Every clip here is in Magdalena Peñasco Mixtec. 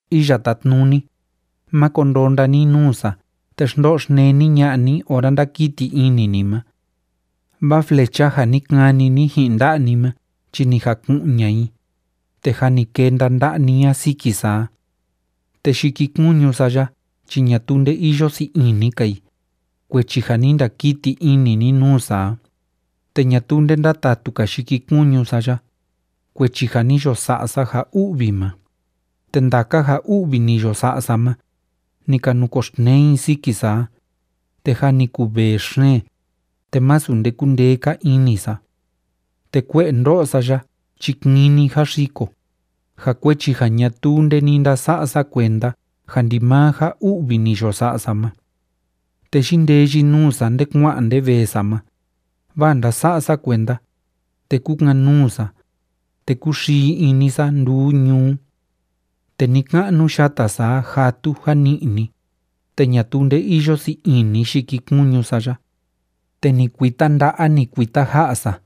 Iya Tátnuni, máko ndonda ni nuu sa te xndo'o xneni ña'a ni ora ndákiti ini ni ma. Vaa flecha ja ni kani ni ji'in nda'a ni ma chi ni jaku'un ña'a i, te jâ ni kenda nda'a ni a siki sa a. Te yikikuñu sa ya chi ñatuu nde iyo sii ini‑ka i, kuechi ja ni ndakiti ini ni nuu sa a, te ñatuu nde ndátatu‑ka yikikuñu sa ya, kuechi ja ni yo sa'a sa ja u'vi ma, Te ndaka ja u'vi ni yo sa'a sa ma, ni ka nukoxtnee i siki sa a, te jâ ni kuvee xeen, te masu nde kúndee‑ka ini sa. Te kue'e ndó'o sa ya chi kini jáxiko, ja kuechi ja ñatuu nde ni ndasa'a sa kuenda ja ndimaa ja u'vi ni yo sa'a sa ma. Te yindeyi nuu sa nde kua'an nde vee sa ma, vaa ndása'a sa kuenda, te kúkan‑nuu sa, te kúxii ini sa nduu ñuu. Te ni‑ka'nu yata sa a játu jani'ni, te ñatuu nde iyo sii ini yikikuñu sa ya. Te ni kuita nda'a, ni kuita ja'a sa,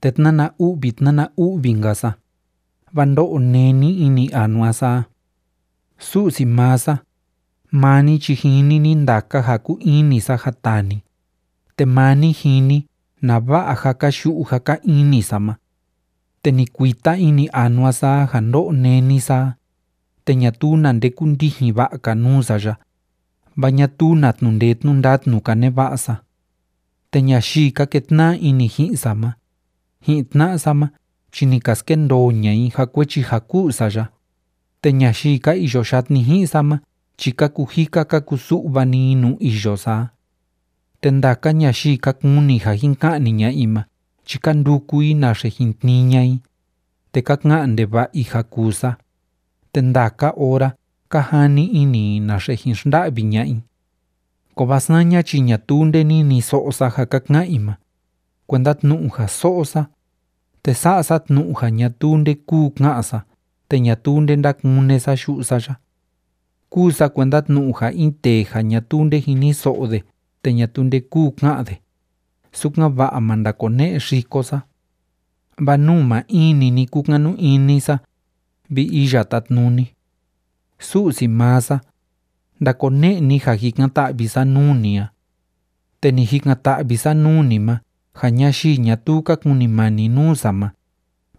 te tnána u'vi tnána u'vi‑nka sa, vaa ndó'o néni ini anua sa a. Su'si maa sa, maa ni chi jini ni ndaka ja kúu ini sa ja taa ni, te maa ni jini nava'a jáka yu'u jáka ini sa ma. Te ni kuita ini anua sa a ja ndó'o néni sa a, te ñatuu na nde kúndijin va'a‑ka nuu sa ya, vaa ñatuu na tnu'u ndee tnu'u ndatnu‑ka neva'a sa. Te ñayii ka ketna'a ini ji'in sa ma, ji'in tna'a sa ma chi ni ka skendoo ña'a i ja kuechi ja ku'u sa ya, te ñayii ka iyo yatni ji'in sa ma chi ka kujika ka kusu'va‑ni i nuu iyo sa a. Te ndaka ñayii ka kuni ja jin ka'ni ña'a i ma chi ka nduku i naxe jin tnii ña'a i, te ka ka'an ndeva'a i ja kuu sa, te ndaka ora ka jani ini i naxe jin xnda'vi ña'a i. Kovaa saña chi ñatuu nde niniso'o sa ja ka ka'an i ma, kuenda tnu'u ja so'o sa, te sa'a sa tnu'u ja ñatuu nde kúu ka'an sa te ñatuu nde ndákune sa yu'u sa ya. Kúu sa kuenda tnu'u ja in tee ja ñatuu nde jiniso'o de te ñatuu nde kúu ka'an de, sukan‑va'a ma ndakone'e xiko sa. Vaa nuu maa in‑ni ni kúkanu ini sa, vi Iya Tátnuni. Su'si maa sa, ndakone'e ni ja jikan‑ta'vi sa nuu ni a. Te ni jikan‑ta'vi sa nuu ni ma ja ñayii ñatuu ka kunimani nuu sa ma,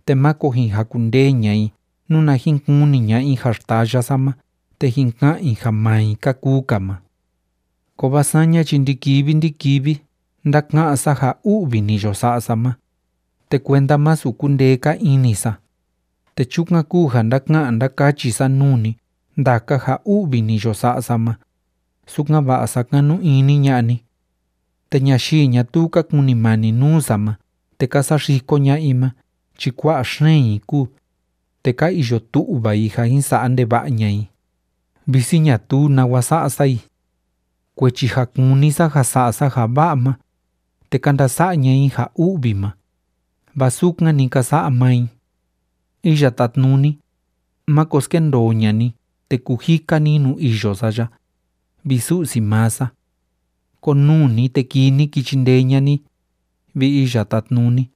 te máko jin jakundee ña'a i nuna jin kuni ña'a i ja xtaya sa ma te jin ka'an i ja maa i ka kuu‑ka ma. Kovaa saña chi ndi‑kivi ndi‑kivi ndáka'án sa ja u'vi ni yo sa'a sa ma, te kuenda masu kundee‑ka ini sa. Te chukan kúu ja ndáka'an ndákachi sa nuu ni ndaka ja u'vi ni yo sa'a sa ma, sukan‑va'a sakanu ini ña'a ni. Te ñayii ñatuu ka kunimani nuu sa ma te ka saxiko ña'a i ma chi kua'a xeen i kúu, te ka iyo tu'va i ja jin sa'a ndeva'a ña'a i, visi ñatuu nawa sa'a sa i. Kuechi ja kúni sa ja sa'a sa ja va'a ma, te ka ndasa'a ña'a i ja u'vi ma, vaa sukan‑ni ka sa'a maa i. Iya Tátnuni, máko skendoo ña'a ni te kujika ni nuu iyo sa ya, vi Su'si maa sa. Konuu ni, te kii ni ki chindee ña'a ni, vi Iya Tátnuni,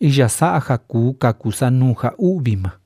iya sa'a ja kuu kaku sa nuu ja u'vi ma.